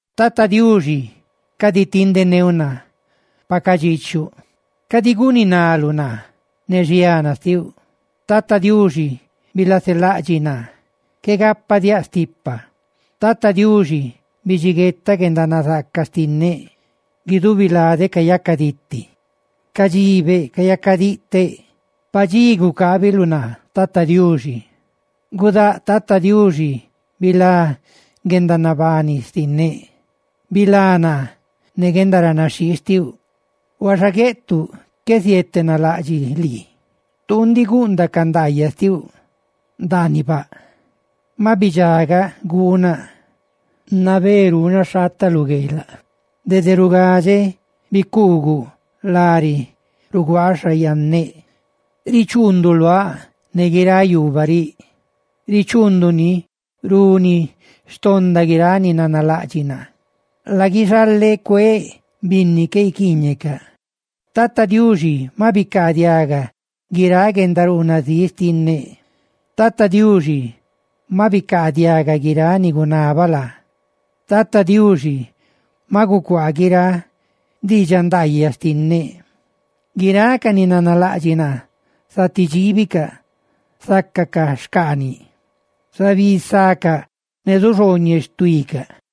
Tata Diuxi, cadi tindeneuꞌ naa pa cadxiichuꞌ, cadi guninaluꞌ naa ne xiana xtiuꞌ. Tata Diuxi, bilaselaꞌdxiꞌ naa qué gapadiáꞌ stipa. Tata Diuxi, bidxiguetaꞌ guendanazaaca xtinneꞌ, guidubi ladeꞌ cayacaditi. ¡Cadxibeꞌ, cayacadiꞌteꞌ! Padxí gucábiluꞌ naa tata Diuxi. Gudáꞌ Tata Diuxi, ¡bilá guendanabani xtinneꞌ!, ¡bilá naa ne guendaranaxhii xtiuꞌ! Huaxa gueꞌtuꞌ qué zietenalaꞌdxiꞌ lii; tuu ndiꞌ guundaꞌ ca ndaayaꞌ xtiuꞌ ndaaniꞌ baꞌ. Maꞌ bidxagaꞌ guunaꞌ; nabé ruunaꞌ xhaataꞌ lu gueelaꞌ dede rugadxeꞌ bicuuguꞌa lari ruguaa xa iqueꞌ. Richuunduꞌ luáꞌ ne guiráꞌ yuubaꞌ riꞌ; ¡richuunduni runi xtonda guiráꞌ ni nanalaꞌdxiꞌ naa! ¡Laguixaleꞌ cueeꞌ binni qué guiquiiñecaꞌ, Tata Diuxi maꞌ bicaadiaga guiráꞌ guendaruunazíꞌ xtinneꞌ! Tata Diuxi maꞌ bicaadiaga guiráꞌ ni gunabaꞌ laa, ¡Tata Diuxi maꞌ gucuaa guiráꞌ diidxaꞌ ndaayaꞌ xtinneꞌ! Guiráꞌ ca ni nanalaꞌdxiꞌ naa zati dxiibicaꞌ, zácacaꞌ xcaaniꞌ; ¡zabisácaꞌ ne zuxhooñeꞌ xtuícaꞌ!